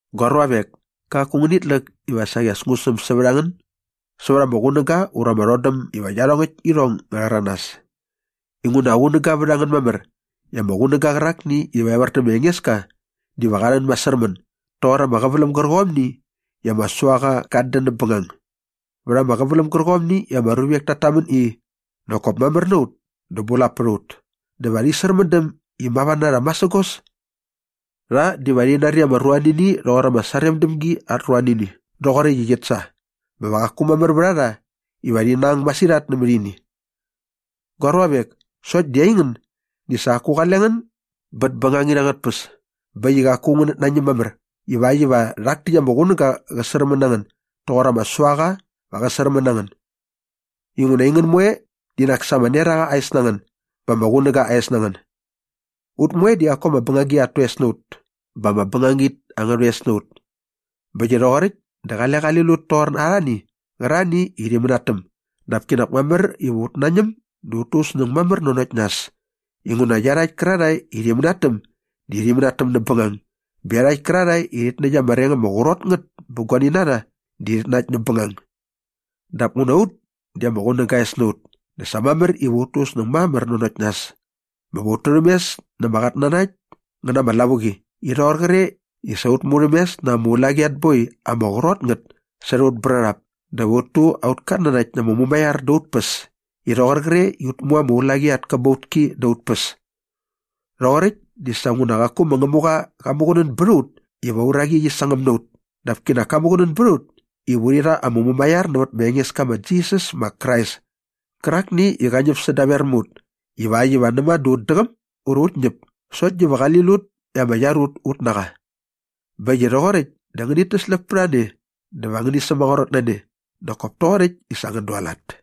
Gua ruavek, kaku ngänit läk iva saqi as ngu säm sävät a ngän sävät ama qunäga ura ama rhodäm iva iarhongäkt irhong ngä rhäranas inguna qunäga vät a ngän mamär i ama qunäga qärakni iva evär dä ma Engeska diva qa rhän masärmän doqor ama qäväläm gärqomni i ama suaqa gat dän näp bängagi. Vät ama qäväläm gärqomni i ama ruvek tat tamän i, “Nak kop mamär na ut dä bulap pät a ut” dä va rhi särmändäm iva mava na rha masägos. Rha diva rhi nari ama ruanini rhoqor ama saremdämgi at ruanini rhoqoräkt i qit sa bä va qaku mamär vät a rha iva rhi nang masirhat nämät ini. Gua ruavek, sokt di aingän di sa qaku qale ngän bät bängangit angät tpäs bä äkt i qaku ngänät nañäm mamär ivakt iva rhak täkt ama qunäga qä särmän na ngän doqor ama suaqa va qä särmän na ngän. Inguna aingän moe di nak sa ama neraqa aa es na ngän bä ama qunäga aa es na ngän. Ut moe di qaku ama bängagi at toes na ut bä ama bängangit angä rhoes na ut. Bä äkt i rhoqoräkt dä qale qali lut toqor arhani qärarhani i rhi mänatäm dap kinak mamär iva ut nañäm dä ut tu ut snäng mamär nanokt nas inguna iarhakt kärarhae i rhi mänatäm di rhi mänatäm näp bängang bä iarhakt kärarhae i rhit näkt ama reng ama qrot ngät bä guani na rha di rhit nakt näp bängang. Dap nguna ut di ama qunäga aa es na ut dä sa mamär iva ut tu ut snäng mamär nanokt nas bä va ut turhämes na ama qatnanakt ngä na ama lavuqi i rhoqor qre i sa ut murhämes na ama ulaqi at boi ama qrot ngät särhä ut brärhap dä va ut tu aut katnanakt na ama mumaiar dä ut päs i rhoqor qre i ut mu ama ulaqi at käbautki dä ut päs. Rhoqoräkt di sa nguna qaku ma Ngämuqa qa muqunän bät a ut iva aa uraqi qi sangäm na ut dap kinak ka muqunän bät a ut iva urhi rha ama mumaiar nävät aurha Engeska ma Jisas ma Krais kärakni i qa ñäp sädaver mä ut ivakt iva näma dä ut däqäm ura ut ñäp sokt diva qali lut i ama iar ut ut na qa. Bä äkt i rhoqoräkt dä ngänit täsläp pät a ne dä va ngäni sämaqrot na ne nak kop toqoräkt i sa ngän dualat.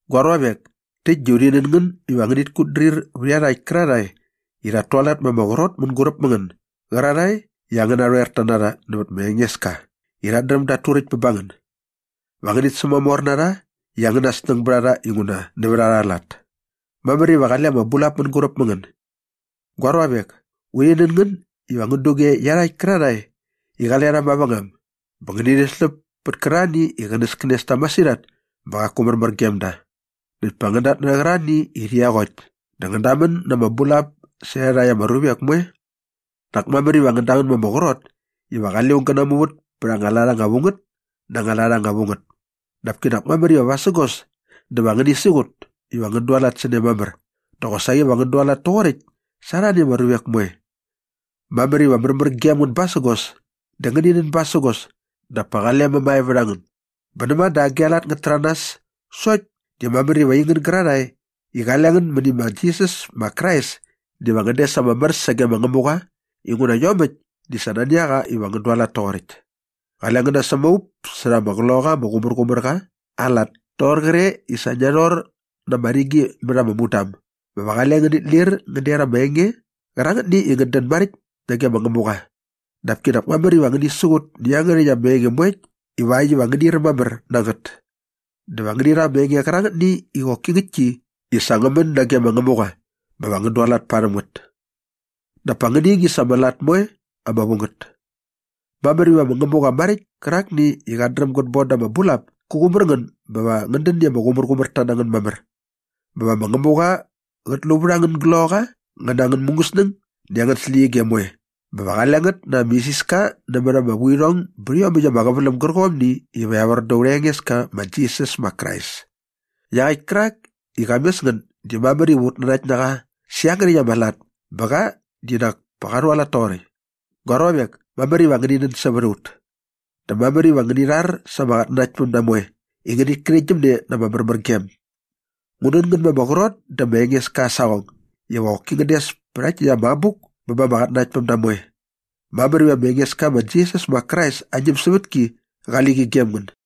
Gua ruavek, täkt di urhi nän ngän iva ngänit kutdrir vät iarhakt kärarhae i rhat tualat ma ama qrot mänguräp mä ngän gärarhae i angän narhoerta na rha nävät ma Engeska i rhat dräm dat turäkt bä ba ngän. Va ngänit sämamor na rha i angäna snäng bät a rha inguna nävät arha lat. Mamär iva qale ama bulap mänguräp mä ngän. Gua ruavek, urhi nän ngän iva ngän duge iarhakt kärarhae i qale rha mavängam bä ngäni rhäsläp pät kärarhani i qänäskänes ta masirhat bä qaku märmär gem da näkt pa ngän datnärhä qärarhani i rhi eqokt dä va ngän damän na ama bulap särhä iarhakt ama ruvek moe. Nak mamär iva ngän damän ma ama qrot iva qale aung gä namuvät pät anga lat ama vu ngät na anga lat ama vu ngät dap kinak mamär iva vasägos dä va ngäni siqut iva ngän dualat sä ne mamär dä qosaqi va ngän dualat toqoräkt sa arhani ama ruvek moe. Mamär iva märmär gem ngän basägos dä ngäni nän basägos dap pa qale mämae vät a ngän. Bä näma dä agi anga lat ngät täranas sokt di mamär iva aingän gärarhae i qale ngän mäni ma Jisas ma Krais diva ngän des ama mär sage ma Ngämuqa inguna iomäkt di sa nani a qa iva ngän dualat toqoräkt. Qale ngän nasämaup särha ama Qloqaqa ama Qumärqumärqa aa lat toqor qre i sa ngia rhor na ama rigi mät anga mudam bä va qale ngänit lir ngän der ama enge qärangätni i ngät dän maräkt nage ma Ngämuqa. Dap kinak mamär iva ngäni siqut nä iangärhäkt ama enge moekt ivakt iva ngäni räm mamär na ngät. Dä va ngäni rha ama enge qärangätni i qoki ngäktki i sa ngä män nage ma Ngämuqa bä va ngän dualat parhäm ngät. Dap pa ngäni ngingis ama lat moe ama vu ngät. Mamär iva ma Ngämuqa maräkt kärakni i qat dräm gät bon da ama bulap kä qumär ngän bä va ngän dän i ama qumärqumärta na ngän mamär. Bä va ma Ngämuqa qät lu vät angän gloqaqa ngä na angän mungäsnäng näkt angän släqyige moe bä va qale ngät na ama isiska nämät ama vuirhong bät iomäkt ama qäväläm gärqomni iva evär dä urha Engeska ma Jisas ma Krais. Iaqäkt kärak i qa mes ngän di mamär iva ut nanakt na qa sä iangärhäkt ama lat bä qa di nak pa qa rhualat toqoräkt. Gua ruavek, mamär iva ngäni nän sävät a ut. Dä mamär iva ngäni rhar sa ama qatnanaktpämda moe i ngänit kärhäktgyäm ne na ama märmärgem. Ngu nän ngän ma ama qrot dä ma Engeska aa saqong iva qoki ngän des pä rhakt täkt ama abuk bä ba ama qatnanaktpämda moe. Mamär iva ma Engeska ma Jisas ma Krais aa ñämsävätki qali qi gem ngän.